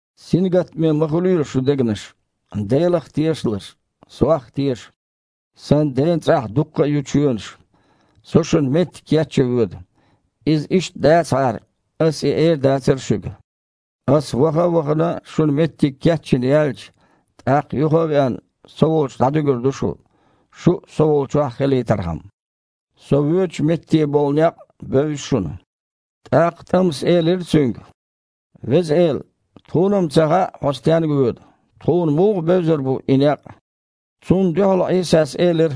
«Сингаттаме ма хуьлийла шун дегнаш. Делах а тешалаш, Сох а теша. Сан Ден цІахь дуккха ю чоьнаш. Со шуна меттиг кечъян воьду. Иза иштта дацахьара, Ас и эр дацара шуьга. Аса, ваха а вахана, шуна меттиг кечйина яьлча, тІаккха юха а веана, Со волчу дІадуьгур ду шу, шу а Со волччохь хилийтархьама. Со воьдучу метте болу некъ а бевза шуна». ТІаккха ТІамас элира Цуьнга: «Веза Эла, тхуна-м ца хаьа, Хьо стенга воьду, тхуна муха бевзар бу и некъ?» Цунна дуьхьал Іийсас элира: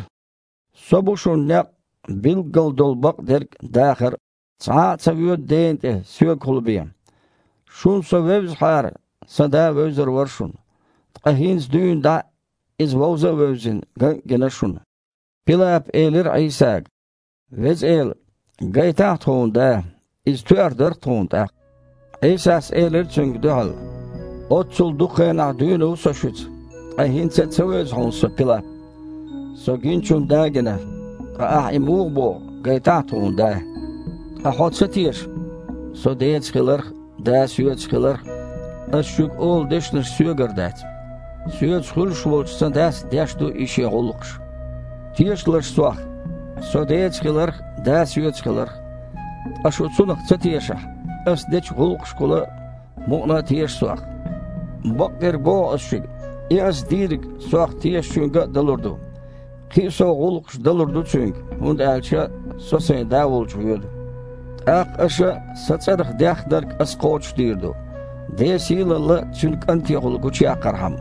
«Со бу шуна некъ а, билггал долу бакъдерг а, дахар а. Цхьа а ца воьду Дена тІе, Соьгахула бен. Шуна Со вевзахьара, Сан Да а вевзар вара шуна. Ткъа хІинца дуьйна дІа Иза вовза а вевзина, ган а гина шуна». Пилапа элира Іийсага: «Веза Эла, гайтахьа тхуна Да, иза тоьар дара-кх тхуна тІаккха». Іийсас элира цуьнга дуьхьал: «Оццул дукха хенахь дуьйна ву Со шуьца, ткъа хІинца а ца вевза хьуна Со, Пилап? Со гиначунна Да а гина, ткъа ахьа и муха боху: „Гайтахьа тхуна Да“? Ткъа хьо ца теша, Со Деца хиларх а, Да Соьца хиларх а? Аса шуьга олу дешнаш Соьгара дац. Соьца хуьлуш волчу Сан Дас деш ду и Шен гІуллакхаш. Тешалаш Сох, Со Деца хиларх а, Да Соьца хиларх а. Ткъа шу цунах ца тешахь, Ас дечу гІуллакхашкахула мукъана а теша Сох. Бакъдерг боху Ас шуьга: и Ас дийриг Сох тешачуьнга а далур ду. Кхин а сов гІуллакхаш далур ду цуьнга, хІунда аьлча Со Сайн Да волчу воьду. ТІаккха аша Сан цІарах деххнарг Ас кхочушдийр ду, Ден сийлалла Цуьнан КІантехула гучуяккхархьама.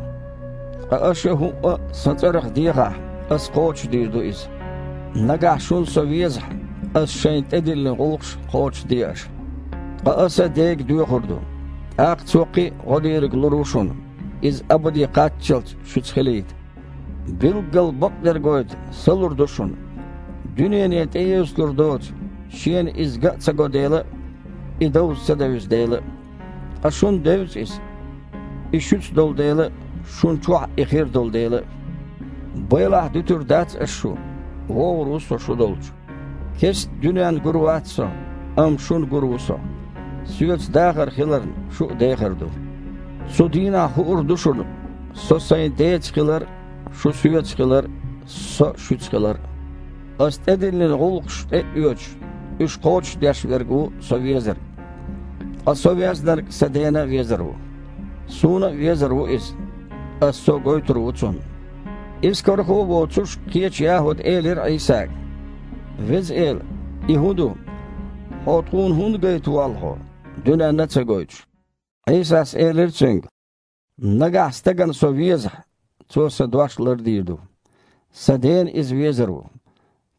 Ткъа аша хІуъа а Сан цІарах дехахь, Ас кхочушдийр ду иза». «Нагахь шуна Со везахь, Ас шайна тІедиллина гІуллакхаш а кхочушде аша. Ткъа Аса Дега доьхур ду, тІаккха Цо кхин „гІо Дийриг“ лур ву шуна, Иза абаде кхаччалц шуьца хилийта. Билггал бакъдерг гойту Са лур ду шуна, дуьнене тІеэцалур доцу, шена Иза ган а ца го дела а, И довза а ца девза дела а. Ткъа шуна девза Иза, И шуьца долу дела а, шуна чохь И хир долу дела а. Байлахь дуьтур дац Ас шу. ВогІур ву Со шу долчу. Кестта дуьненна гур вац Со, амма шуна гур ву Со. Соьца дахар хиларна, шу а дехар ду. Цу дийнахь хуур ду шуна Со Сайн Деца хилар а, шу Соьца хилар а, Со а шуьца хилар а. Ас тІедиллина гІуллакхаш тІе а оьцуш, уьш кхочушдеш верг ву Со везарг. Ткъа Со везнарг Сан Дена а везар ву. Суна а везар ву иза, Аса Со гойтур ву цунна». Искархо а воцуш, кхечу ЯхІуда элира Іийсага: «Веза Эла! И хІун ду? Хьо тхуна хІунда гайта воллу Хьо, дуьненна а ца гойтуш?» Іийсас элира цуьнга: «Нагахь стагана Со везахь, цо Сан дош лардийр ду. Сан Дена иза везар ву,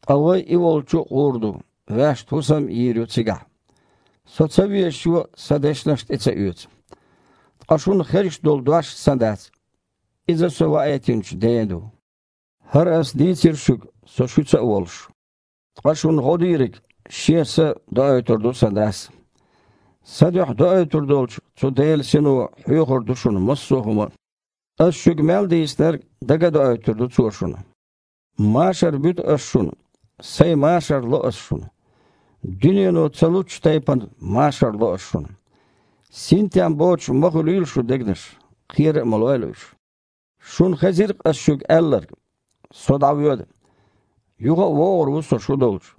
ткъа Вай и волчу а гІур ду, ваьшна хІусам а йийр ю цигахь. Со ца везачо Сан дешнаш а тІе ца оьцу. Ткъа шуна хезаш долу дош Сан дац. Иза Со ваийтинчу Ден ду. ХІара Ас дийцира шуьга, Со шуьца а волуш. Ткъа шуна гІо Дийриг, Шен Са, доуьйтур ду Сан Дас. Сан дуьхьа доуьйтур долчу цу Делан Сино хьоьхур ду шуна массо хІума а. Ас шуьга мел дийцинарг дага а доуьйтур ду Цо шуна. Машар буьту Ас шуна, Сайн машар ло Ас шуна. Дуьнено ца луччу тайпана, машар ло Ас шуна. Синтем боцуш ма хуьлийла шун дегнаш, кхера а ма лойла уьш. Шуна хезира-кх Ас шуьга аьлларг: „Со дІавоьду, юха а вогІур ву Со шу долчу“.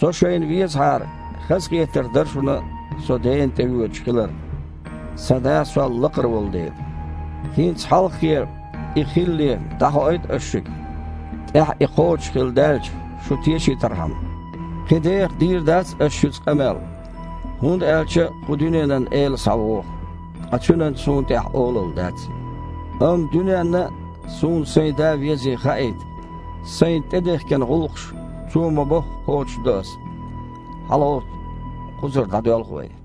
Со шайна везахьара, хазахетар дара шуна Со Дена тІевоьдуш хилар, Сан Да Сол лакхара волу дела. ХІинца, хьалххе, и хилале, дІахоуьйту Ас шуьга, тІаьхьа и кхочушхилла даьлча, шу тешийтархьама. Кхин деха дийр дац Ас шуьца къамел, хІунда аьлча кху дуьненан эла схьавогІу, ткъа цуьнан Суна тІехь олалла дац. Амма дуьненна а Суна Сайн Да везий хаийта, Сайна тІедехкина гІуллакхаш, Цо ма-бохху, кхочуш до Ас. ХьалагІовтта. Кхузара дІадоьлху вай».